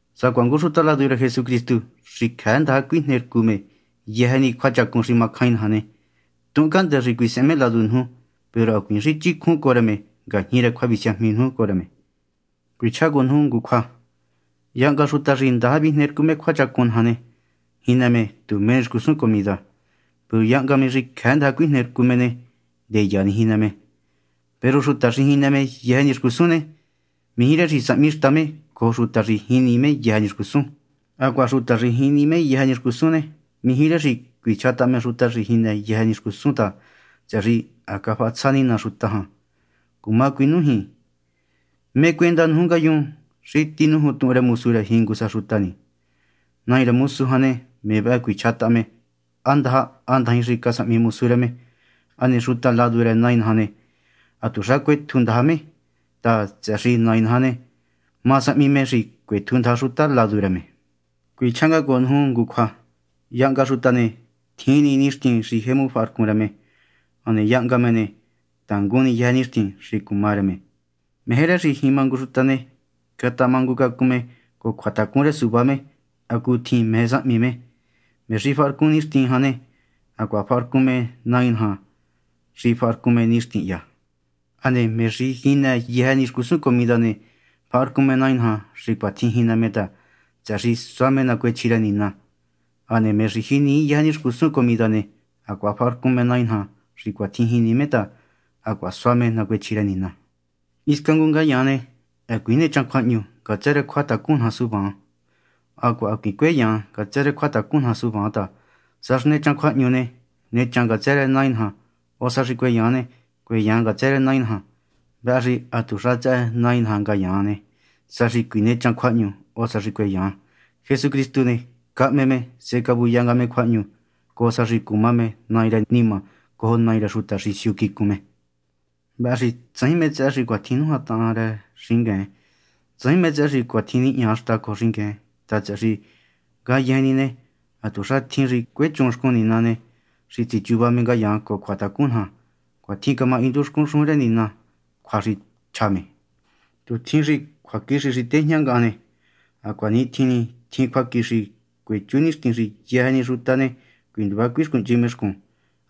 Sacuaha ngu xuta ladu rë Jesucristu xi cjëë ndaja cuijnercu me yëjë ni cjuachacun xi macjain naja ne, tuhun cahndë́ xi cuisehen me ladu nuju, peru hacuiin xi chicjun cojo me ngajñi rë cjuavisiajmi nuju cojo rë me. Cuichjá cojo nuju ngu cjua. Yahnga xuta xi ndaja vijne rcu me cjuachacun naja ne, jinë me tu mé ni xcusun comida. Peru yahnga me xi cjëë ndaja cuijne rcu me ne, ndeya ni jinë me. Peru xuta xi jinë me yëjë ni xcusun ne, mijí rë xi sahmi xta me cojo xuta xi jinii yëjë ni xcusun. Hacuaha xuta xi jinii me yëjë ni xcusun ne, mijí rë xi cuichjataha me xuta xi jinë yëjë ni xcusun ta, tsëhë xi ha cafahatsja Nina xuta jan. Cuma cuinújin: ¿mé cuenda nuju ngayun xi nújuntuhun rë mosu rë jingu sa xuta ni? Nai rë mosu jan ne, me vëhë cuichja me há ndaja há ndajin xa casahmi mosu rë me. Hane xuta ladu rë Nai naja jan ne, hatuxa cuetju ndaja me ta, tsëhë xi Nai naja ne, ma sahmi me xi cuetju ndaja xuta ladu rë me. Cuichjá nga cojo nuju ngu cjua. Yahnga xuta ne, tjin ni nixtin xi jemu faharcun me. Hane yahnga me ne, tangun yëjë ni nixtin xi cuma rë me. Meje rë xi jima ngu xuta ne, catamangucacun me cojo cjuatacun rë suvá me hacutjin meje sahmi me. Me xi faharcun nixtin jan ne, hacuaha faharcun me Nai naja xi faharcun me nixtin hya. Hane me xi jinë yëjë ni xcusun comida ne, faharcun me Nai naja xi cuatjin jinë me ta, tsëhë xi sua me nacuechji rë Nina. Hane me xi jinii yëjë xcusun comida ne, hacuaha faharcun me Nai naja xi cuatjin jinii me ta hacuaha sua me nacuechji rë Nina. Hisca ngu ngayaan ne, hacuiin nechan cjuahñu ngatsë rë cjuatacun naja suvaan, hacuaha hacuiin cueyan ngatsë rë cjuatacun naja suvaan ta, sa xi nechan cjuahñu ne, nechan ngatsë rë Nai naja, o sa xi cueyan ne, cueyan ngatsë rë Nai naja. Vëhë xi hatuxa tsëhë Nai naja ngayaan ne, sa xi cuinechan cjuahñu o sa xi cueyan. Jesucristu ne, cahme me sehe cavuya nga me cjuahñu cojo sa xi cuma me Nai rë nima cojo Nai rë xuta xi siu quicun me. Vëhë xi tsajin mé tsëhë xi cuatjin nújantahan rë xingueen, tsajin mé tsëhë xi cuatjin nihña xta cojo xingueen ta, tsëhë xi ngayejen ni ne, hatuxa tjin xi cuechun xcun Nina ne, xi tsichuva me ngayaan cojo cjuatacun naja. Cuitjin camahindu xcun xujun rë Nina cjua xi cachja me: Tu tjin xi cjuaquixi xi tejña ngahan ne, hacuanitjin ni tjin cjuaquixi cuechú nixtin xi yëjë ni xuta ne, cuinduva cuixcuhnchi me xcun,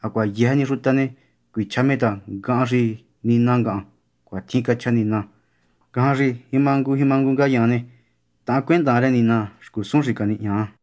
hacuaha yëjë ni xuta ne, cuichja me ta ngahan xi Nina ngahan. Cuatjin cachja Nina. Ngajan xi jima ngu jima ngu ngayaan ne, taancuendan rë Nina xcusun xi canihña.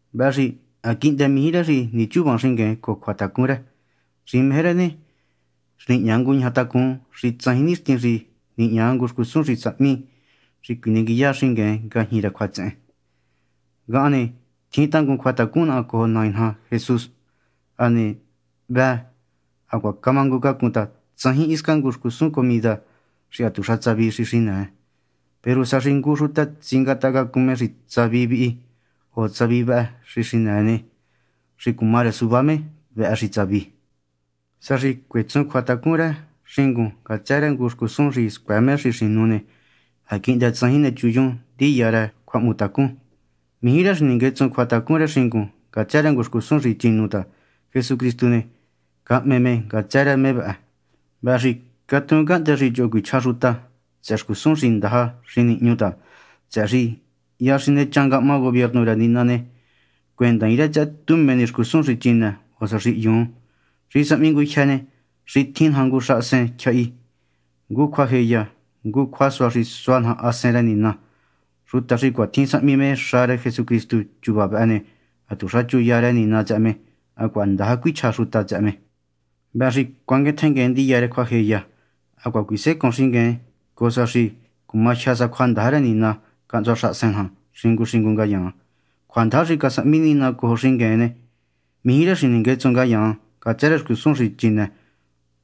Vëhë xi ha quihndë mijí rë xi nichuvan xingueen cojo cjuatacun rë. Xi meje rë ne, xi cuejñangutacun xi tsajin nixtin xi nihña ngu xcusun xi sahmi xi cjuinenguiya xingueen ngajñi rë cjuatsehen. Ngahan ne, tjin tangun cjuatacun naha cojo Nai naja Jesús. Hane ha hvë, hacuaha camangucacun ta tsajin hisca ngu xcusun comida xi hatuxa tsavi xi xinëë. Peru sa xi ngu xuta tsingatahacacun me xi tsavi vihi o tsavi vëhë xi xinëë ne, xi cuma rë suvá me vëhë xi tsavi. Sa xi cuetsun cjuatacun rë xingun ngatsë rë ngu xcusun xi scuëë me xi xinu ne, ha quihndë tsajin nechunyun ndiya rë cjuahmutacun. Mijí rë xi ninguetsun cjuatacun rë xingun ngatsë rë ngu xcusun xi chinu ta, Jesucristu ne, cahme me ngatsë rë me vëhë. Vëhë xi xicatuun cahndë xi choho cuichja xuta tsëhë xcusun xi ndaja xi nihñu ta, tsëhë xi hya xi nechan ngahma gubiernu rë Nina ne, cuendaain rë tsëhë tu mé ni xcusun xi chinë o sa xi hyun. Xi sahmi ngujyë ne, xi tjin naja ngu xahasen tyjahi, ngu cjuajeya, ngu cjuasua xi sua naja Hasen rë Nina. Xuta xi cuatjin sahmi me xa rë Jesucristu chuva vëhë ne, hatuxa chuya rë Nina tsëhë me, hacuaha ndaja cuichja xuta tsëhë me. Vëhë xi cuanguen tjenguen ndiya rë cjuajeya, hacuaha cuisecoon xingueen cojo sa xi cuma jyë sa cjuandaja rë Nina cahntsua xahasen naja xingu xingu ngayaan. Cjuandaja xi casahmi Nina cojo xingueen ne, mijí rë xi ninguetsun ngayaan ngatsë rë xcusun xi chinë.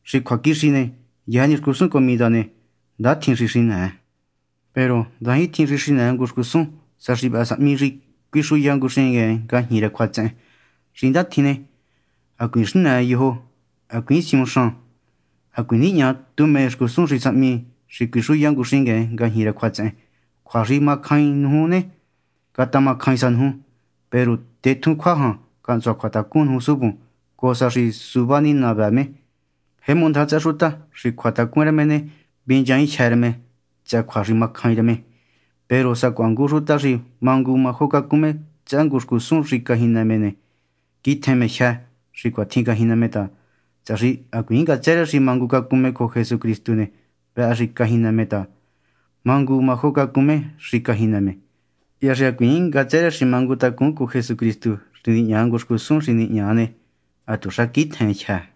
Xi cjuaquixi ne, yëjë ni xcusun comida ne, ndatjin xi xinë. Peru ndajintjin xi xinëë ngu xcusun sa xi vëhë sahmi xi cuixuya ngu xingueen ngajñi rë cjuatsehen. Xi ndatjin ne, hacuiin xinë yojo, hacuiin siuhun xan, hacuiin nihña tu mé ni xcusun xi sahmi xi cuixuya ngu xingueen ngajñi rë cjuatsehen. Cjua xi ha macjain nuju ne, catamacjain sa nuju, peru tetjún cjua jan cahntsua cjuatacun nuju suvun cojo sa xi suvá ni Nina vëë me. Jemu ndaja tsëhë xuta xi cjuatacun rë me ne, vinchaainjyë́ rë me tsëhë cjua xi macjain rë me. Peru sacuaha ngu xuta xi mangu majo cacun me tsëhë ngu xcusun xi cajinë me ne, quitjen me jyë́ xi cuatjin cajinë me ta, tsëhë xi hacuiin ngatsë rë xi mangucacun me cojo Jesucristu ne, vëhë xi cajinë me ta mangu majo cacun me xi cajinë me. Hya xi hacuiin ngatsë rë xi mangutacun cojo Jesucristu xi nihña ngu xcusun xi nihña ne, hatuxa quitjen jyë́.